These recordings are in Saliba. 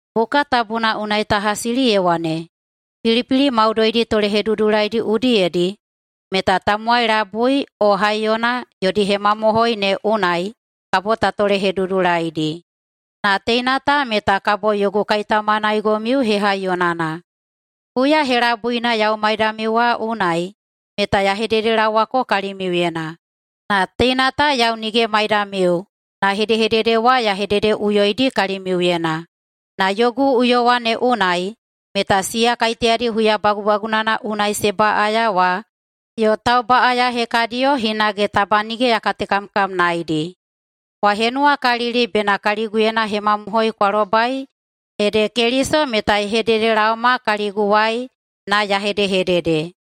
Buka Tabuna unai ta hasili ye wane, “Pilipili maudoidi tolehedudulaidi udiyedi meta tamowai labui o haiyona yodi hemamohoi ne unai kabo ta tolehedudulaidi.” Na teina ta meta kabo yogu kaitaumanaigomiu hehaiyonana. Huya helabuina yau maidamiu wa unai meta ya hededelaowako kalimiuyena, na teina ta yau nige maidamiu na hedehedede wa ya hededeꞌuyoidi kalimiuyena. Na yogu uyowa ne unai meta siya kaiteyadi huya bagubagunana unai se baꞌaya wa yo taubaꞌaya hekadiyo hinage taba nige ya katekamkamnaedi. Kwa henuwakalili bena kaliguyena hemamohoi kwa lobai ede Keliso meta ye hededelaoma kaliguwai na ya hedehedede.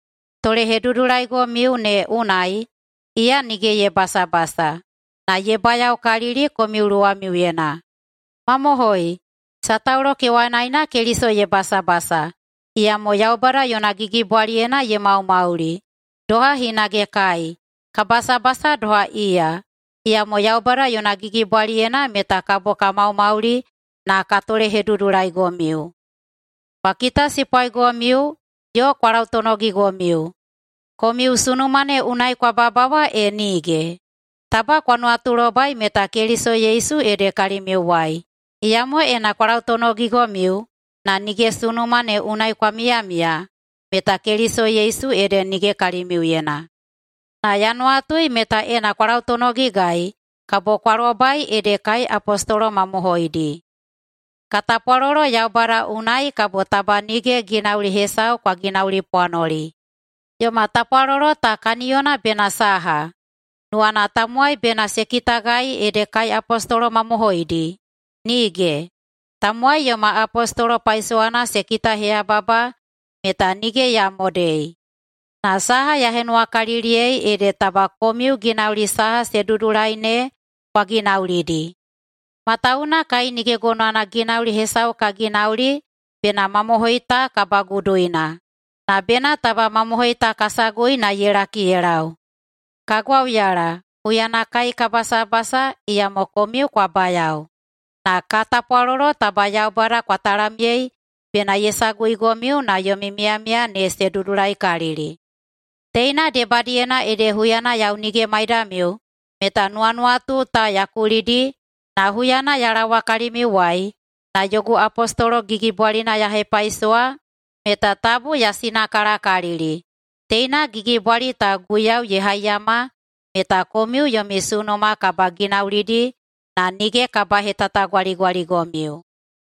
Tolehedudulaigomiu ne unai iya nige ye basabasa, na ye bayaokalili komiu luwamiuyena. Mamohoi, sataulo kewanaena Keliso ye basabasa, iyamo Yaubada yona gigibwaliyena ye maumauli. Doha hinage kai, ka basabasa doha iya, iyamo Yaubada yona gigibwaliyena meta kabo ka maumauli na ka tolehedudulaigomiu. Kwa kitasipwaigomiu yo kwa lautonogigomiu, komiu sunuma ne unai kwa babawa e nige? Taba kwa nuwatulobai meta Keliso Yesu ede kalimiuwai. Iyamo ena kwa lautonogigomiu na nige sunuma ne unai kwa miyamiya meta Keliso Yesu ede nige kalimiuyena. Na ya nuwatui meta ena kwa lautonogigai kabo kwa lobai ede kai apostolo mamohoidi. Ka tapwalolo Yaubada unai kabo taba nige ginauli hesau kwa ginaulipwanoli. Yoma tapwalolo ta kaniyona bena saha? Nuwana tamowai bena se kitagai ede kai apostolo mamohoidi? Nige! Tamowai yoma apostolo paisowana se kitaheyababa meta nige ya modei, na saha ya henuwakaliliyei ede taba komiu ginauli saha se dudulai ne kwa ginaulidi. Matawuwuna kai nige gonowana ginauli hesau ka ginauli bena mamohoi ta kabaguduina, na bena taba mamohoi ta ka sagui na ye laki ye lau. Ka gwauyala huyana kai ka basabasa iyamo komiu kwa bayao. Na ka tapwalolo taba Yaubada kwa talamyei bena ye saguigomiu na yomi miyamiya ne se dudulaikalili. Teina debadiyena ede huyana yau nige maidamiu meta nuwanuwatu ta ya kulidi, na huyana ya laowa kalimiuwai na yogu apostolo gigibwalina ya hepaisowa meta tabu ya sinakalakalili. Teina gigibwali ta Guiyau ye haiyama meta komiu yomi sunuma kabaginaulidi na nige kabahetatagwaligwaligomiu.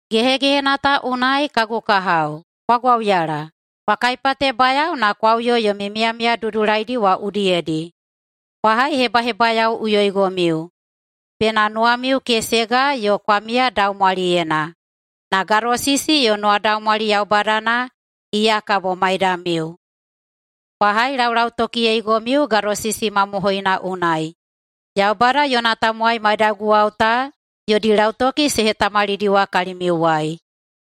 Gehegehena ta unai, kagu kahao, kwa gwauyala! Kwa kaipatebayao na kwa uyo yomi miyamiya dudulaidi wa udiyedi. Kwa haihebahebayaoꞌuyoigomiu. Bena nuwamiu kesega yo kwa miya daumwaliyena. Na gadosisi yo nuwadaumwali Yaubadana, iya kabo maidamiu. Kwa hailaulautokiyeigomiu gadosisi mamohoina unai. Yaubada yona tamowai maidaguwao ta yodi lautoki se hetamalidiwa kalimiuwai.